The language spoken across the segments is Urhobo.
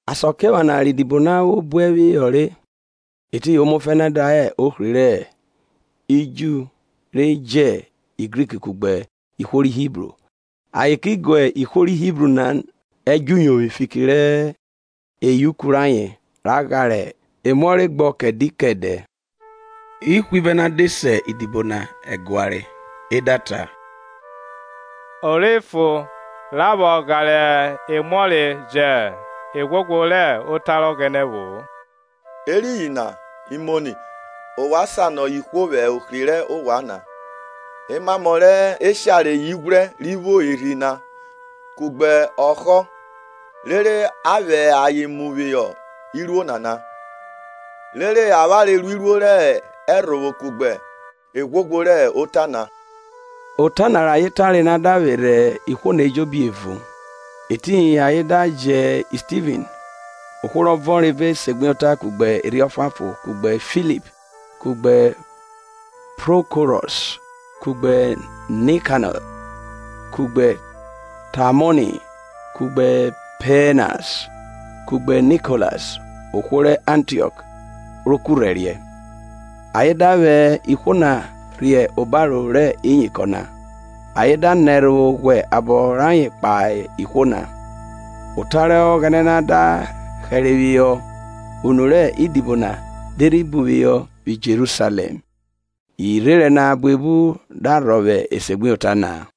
Asakiephana rẹ idibo na vwo buẹ phihọ re, etiyin omaẹfẹnẹ da hẹ ohri ri Ju re jẹ Grik kugbe ihwo ri Hibru, ayen ki guẹ ihwo ri Hibru na ẹdjọuyovwi fiki rẹ eyauku rayen ra ghara emuọre gbọ kẹdẹ kẹdẹ. Ihwivẹ na de se idibo na ẹguare e da ta, o rhe fo ra vwọ gharẹ emuọre jẹ eghwoghwo rẹ Ota rẹ Ọghẹnẹ vwo-o. Eriyin na imoni, ovwan sanọ ihwo vwẹ ohri rẹ ovwan na, emamọ rẹ eshare ighwrẹ, ri vwo Erhi na kugbe ọhọ rere a vwẹ ayen mu phihọ iruo nana. Rere avwanre ruiruo rẹ ẹrhovwo kugbe eghwoghwo rẹ ota na. Ota na rẹ ayen tare na da vwerhe ihwo na ejobi evun, etiyin ayen da jẹ Stivin, ohwo rọ vọnre vẹ esegbuyota kugbe Erhi Ọfuanfon, kugbe Filip, kugbe Prokorọs, kugbe Nikanọ, kugbe Tamọni, kugbe Pamenas, kugbe Nikolas, ohwo rẹ Antiọk ro kurhẹriẹ. Ayen da vwẹ ihwo na rhe obaro rẹ iyinkọn na, ayen da nẹ ẹrhovwo ghwẹ abọ rayen kpahe ihwo na. Ota rẹ Ọghẹnẹ na da hẹre phihọ, unu rẹ idibo na de rhi buphihọ vwi Jerusalẹm, irherẹn na buebu da rhọvwe esegbuyota na.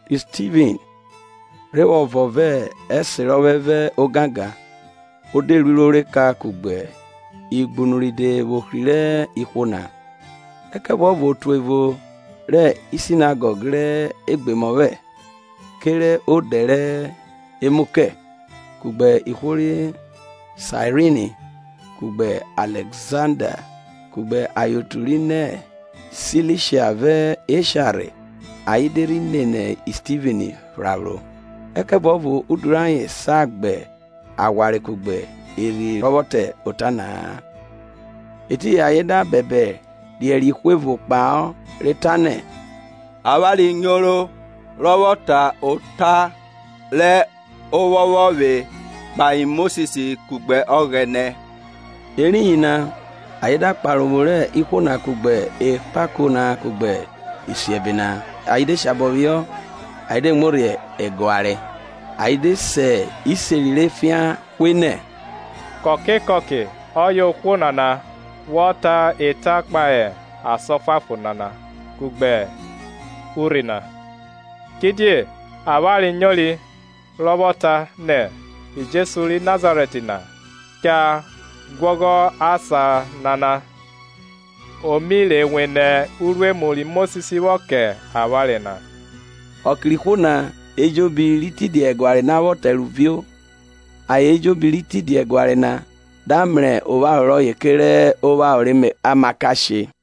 Ri Stivin, rhe vwọ vọn vẹ ẹserọphẹ vẹ ogangan, o de ruiruo rẹ eka kugbe igbunu ride vwẹ ohri rẹ ihwo na. Ẹkẹvuọvo otu evo rẹ sinegọg rẹ Egbomọphẹ (kerẹ odẹ re mu kẹ), kugbe ihwo rẹ Saerini, kugbe Alẹzanda, kugbe ayen otu ri nẹ Silisha vẹ Esha rhe, ayen de rhi nene Stivin phraphro. Ẹkẹvuọvo udu rẹ ayen sa gba aghwanre kugbe Erhi rọ vwọ ta ota na-a. Etiyin ayen da bẹdẹ riẹriẹ ihwo evo kpahọ re ta nẹ, Avwanre nyoro rọ vwọ ta ota rẹ ophọphọvwe kpahe Mosis kugbe Ọghẹnẹ. Eriyin na ayen da kpare ophu rẹ ihwo na kugbe ekpako na kugbe isiẹbe na, ayen de shabọ phihọ ayen de muo rhe ẹguare, ayen de se iseri rẹ efian hwe nẹ, kọke kọke ọye ohwo nana vwọ ta eta kpahe asan ọfuanfon nana kugbe urhi na. Kidie avwanre nyori rọ vwọ ta nẹ, Jesu ri Nazarẹt na cha guọghọ asan nana, o mi rhe wene uruemu ri Mosis vwọ kẹ avwanre na. Ọke rẹ ihwo na ejobi ri tidia ẹguare na vwọ tẹrovio, ayen ejobi ri tidia ẹguare na da mrẹ opharo rọye kerẹ opharo rẹ amakashe.